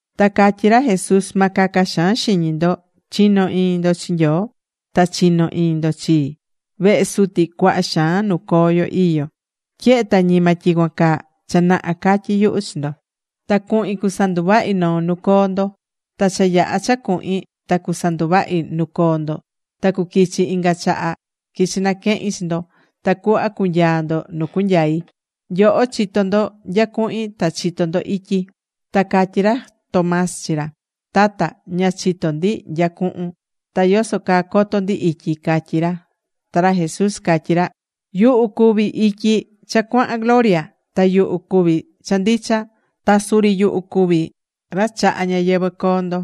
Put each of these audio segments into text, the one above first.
Ta catyí ra Jesús: ―Ma caca xaan xiñi ndo. Chi̱no iñi ndo chi Nyoo, ta chi̱no iñi ndo chii. Vehe Suti cuaha xaan nuu coo ndo iyó. Tyehe ta ñima tyicuan caa, cha naha catyí yuhu chi ndo. Ta cuhin cusanduvahi noo nu coo ndo. Ta cha yaha cha cuhin ta sanduvahi nu coo ndo, ta cuquichi inga chaha, quichi naquehin chi ndo. Tacuhva cunyaa ndo nu cuacunyai. Nyoho chitó ndo nya cuhin, ta chitó ndo ityi. Ta catyí ra Tomás chi ra: ―Tata, ña chitó ndi nya cuhun. Ta ¿yoso caa coto ndi ityi? ―catyí ra. Ta ra Jesús catyí ra: ―Yuhu cuví ityi cha cuahan gloria. Ta yuhu cuví cha ndicha. Ta suri yuhu cuví ra chahá ñayɨvɨ̱ coo ndo.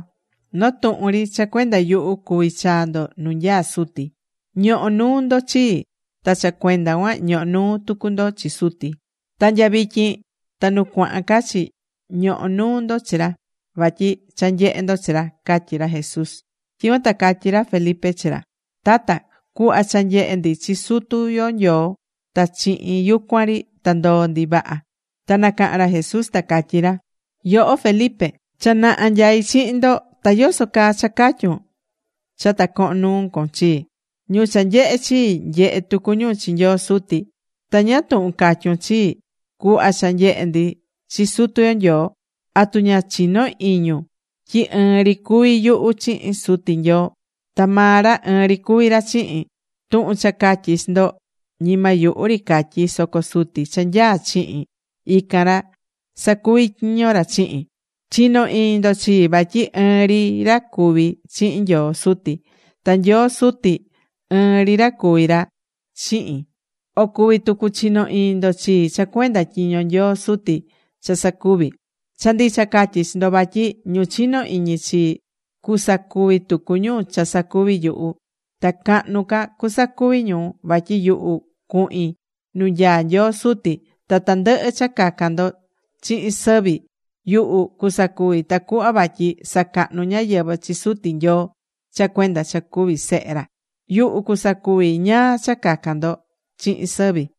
Noo tuhun ri cha cuenda yuhu, cuvi chaa ndo nu nyaá Suti. Ñohó nuu ndo chii, ta cha cuenda cuan ñohó nuu tucu ndo chi Suti. Ta nya vityin ta nu cuahan ca chi, ñohó nuu ndo chi ra, vatyi cha nyehé ndo chi ra ―catyí ra Jesús. Tyicuan ta catyí ra Felipe chi ra: ―Tata, cu̱hva cha nyehe ndi chi Sutu yo Nyoo, ta chihin yucuan ri ta ndoo ndi vaha. Ta nacaha̱n ra Jesús, ta catyí ra: ―Yoho Felipe, cha naha nyaí chihin ndo, ta ¿yoso caa cha catyún cha ta cohon nuu con chii? Ñu cha nyehé chii, nyehé tucu ñu chi Nyoo Suti. Ta ¿ñáá tuhun catyún chii: “Cu̱hva cha nyehe ndi chi Sutu yo Nyoo”? ¿Atu ña chinó iñun tyi ɨɨn ri cuví yuhu chihin Suti Nyoo? Ta maa ra ɨɨn ri cuví ra chihin. Tuhun cha catyí chi ndo, ñima yuhu ri catyí, soco Suti cha nyaá chihin, ican ra sacuví tyiño ra chihin. Chi̱no iñi ndo chii vatyi ɨɨn ri ra cuví chihin Nyoo Suti. Ta Nyoo Suti ɨɨn ri ra cuví ra chihin. O cuví tucu chino iñi ndo chii cha cuenda tyiño Nyoo Suti cha sacuví. Cha ndicha catyí chi ndo vatyi ñu chinó iñi chii, cusacuvi tucu ñu cha sacuví yuhu. Ta cahnu ca cusacuvi ñu, vatyi yuhu cuhin nu nyaá Nyoo Suti. Ta tandɨhɨ cha cacan ndo chihin sɨvi, yuhu cusacuvi tacuhva vatyi sacahnu ñáyɨvɨ chi Suti Nyoo cha cuenda cha cuví Sehe ra. Yuhu cusacuvi ñáá cha cacan ndo chihin sɨvi.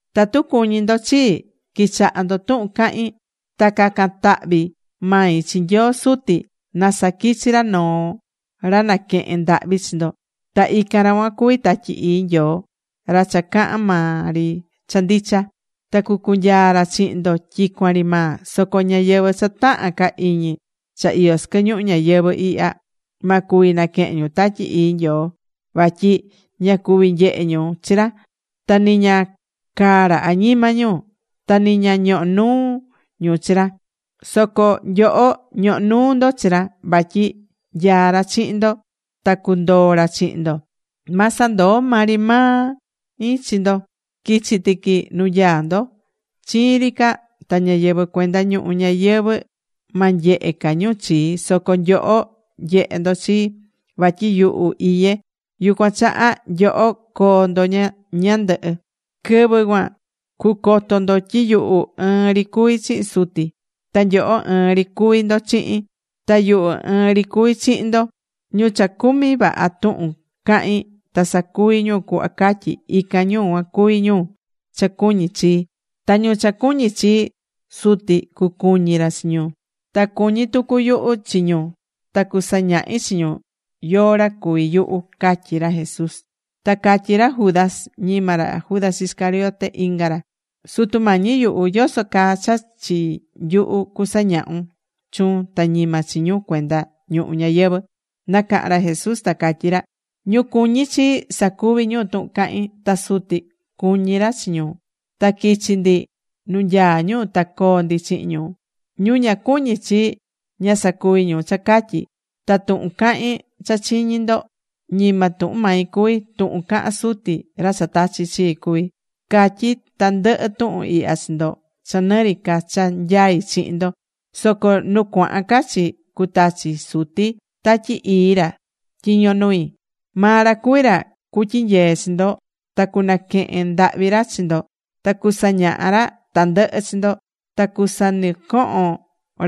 ’Tatu cuñí ndo chii, qui̱chaha ndo tuhun cahín. Ta cacan tahvi mai chi Nyoo Suti na saquichi ra noo ra naquehen ndahvi chi ndo. Ta ican ra cuan cuví Tatyi Ii Nyoo, ra cha cahán maa ri cha ndicha. Ta cucunyaa ra chihin ndo tyicuan ri maa. Soco ñáyɨvɨ cha tahán ca iñi cha iyó sɨquɨ ñuhu ñayɨvɨ̱ ihya ma cuvi naquehen ñu Tatyi Ii Nyoo vatyi ña cuví nyehe ñu chi ra. Ta ni ña caá ra añima ñu. Ta ni ña ñohó nuu ñu chi ra. Soco nyoho ñohó nuu ndo chi ra vatyi nyaá ra chihin ndo ta cuandoo ra chihin ndo. Ma sandoo maa ri mai chi ndo. Quichi tiqui nu nyaá ndo. Chiin ri ca, ta ñáyɨvɨ cuenda ñuhu ñayɨvɨ̱ ma nyehe ca ñu chii. Soco nyoho nyehé ndo chii. Vatyi yuhu iyé, yucuan chaha nyoho coo ndo ñandɨhɨ. Quɨvɨ cuan cucoto ndo tyi yuhu ɨɨn ri cuví chihin Suti. Ta nyoho ɨɨn ri cuví ndo chihin. Ta yuhu ɨɨn ri cuví chihin ndo. Ñu cha cumí vaha tuhun cahín, ta sacuví ñu cuhva catyí, ican ñu cuan cuví ñu cha cuñí chii. Ta ñu cha cuñí chii, Suti cucuñi ra chi ñu. Ta cuñí tucu yuhu chi ñu ta cusañahi chi ñu yóó ra cuví yuhu ―catyí ra Jesús. Ta catyí ra Judas, ñima ra Judas Iscariote, inga ra. ―Sutu Mañi yuhu, ¿yoso caa cha chi nyuhu cusañahun chuun, ta ñima chi ñu cuenda ñuhu ñayɨvɨ̱? Nacaha̱n ra Jesús ta catyí ra: ―Ñu cuñí chii, sacuví ñu tuhun cahín. Ta Suti cuñí ra chi ñu. Ta quichi ndi nu nyaá ñu ta coo ndi chihin ñu. Ñu ña cuñí chii, ña sacuví ñu cha catyí. Ta tuhun cahín cha chiñi̱ ndo, ñima tuhun mai cuví, tuhun cahán Suti, ra cha tachi̱ chii cuví. ’Catyí tandɨhɨ tuhun ihya chi ndo cha nɨ ri ca cha nyaí chihin ndo. Soco nu cuahan ca chi cutachi Suti Tatyi Ii ra tyiño nui. Maa ra cuví ra cutyinyee chi ndo ta cunaquehen ndahvi ra chi ndo ta cusañaha ra tandɨhɨ chi ndo. Ta cusanɨcohon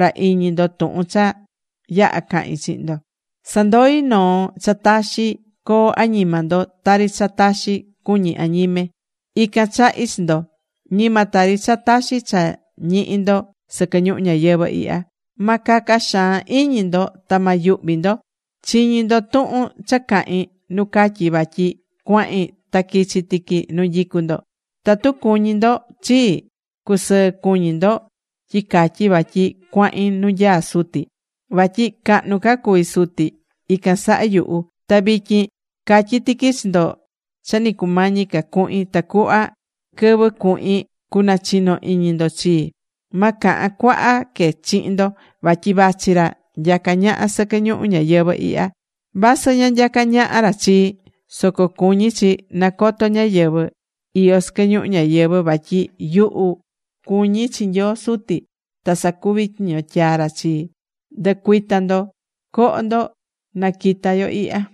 ra iñi ndo tuhun cha yaha cahi̱n chihin ndo. ’Sandoí noo cha taxi coo añima ndo, tari cha taxi cuñí añime. Ican chahí chi ndo. Ñima tari cha taxi cha ñihí ndo sɨquɨ ñuhu ñayɨvɨ̱ ihya. Ma caca xaan iñi ndo ta ma yuhvi ndo. Chiñi̱ ndo tuhun cha cahi̱n nu catyi̱ vatyi cuahin ta quichi tiqui nu nyicú ndo. Tatu cuñí ndo chii, cucusɨɨ cuñi ndo tyi catyi vatyi cuahin nu nyaá Suti. Vatyi cahnu ca cuví Suti ican saha yuhu. Ta vityin catyí tiqui chi ndo cha ni cumañi ca cuhin, tacuhva quɨvɨ cuhin, cunachino iñi ndo chii. ’Ma cahan cuaha que chihin ndo. Vatyi vachi ra nyacá ñaha sɨquɨ ñuhu ñayɨvɨ̱ ihya. Vasɨ ña nyacá ñaha ra chii. Soco cuñí chi nacoto ñáyɨvɨ iyó sɨquɨ ñuhu ñayɨvɨ̱ vatyi yuhu cuñí chi Nyoo Suti, ta sacuví tyiño tyaa̱ ra chii. ’Ndɨ̱cuita ndo. Co̱ho ndo, naquita yo ihya.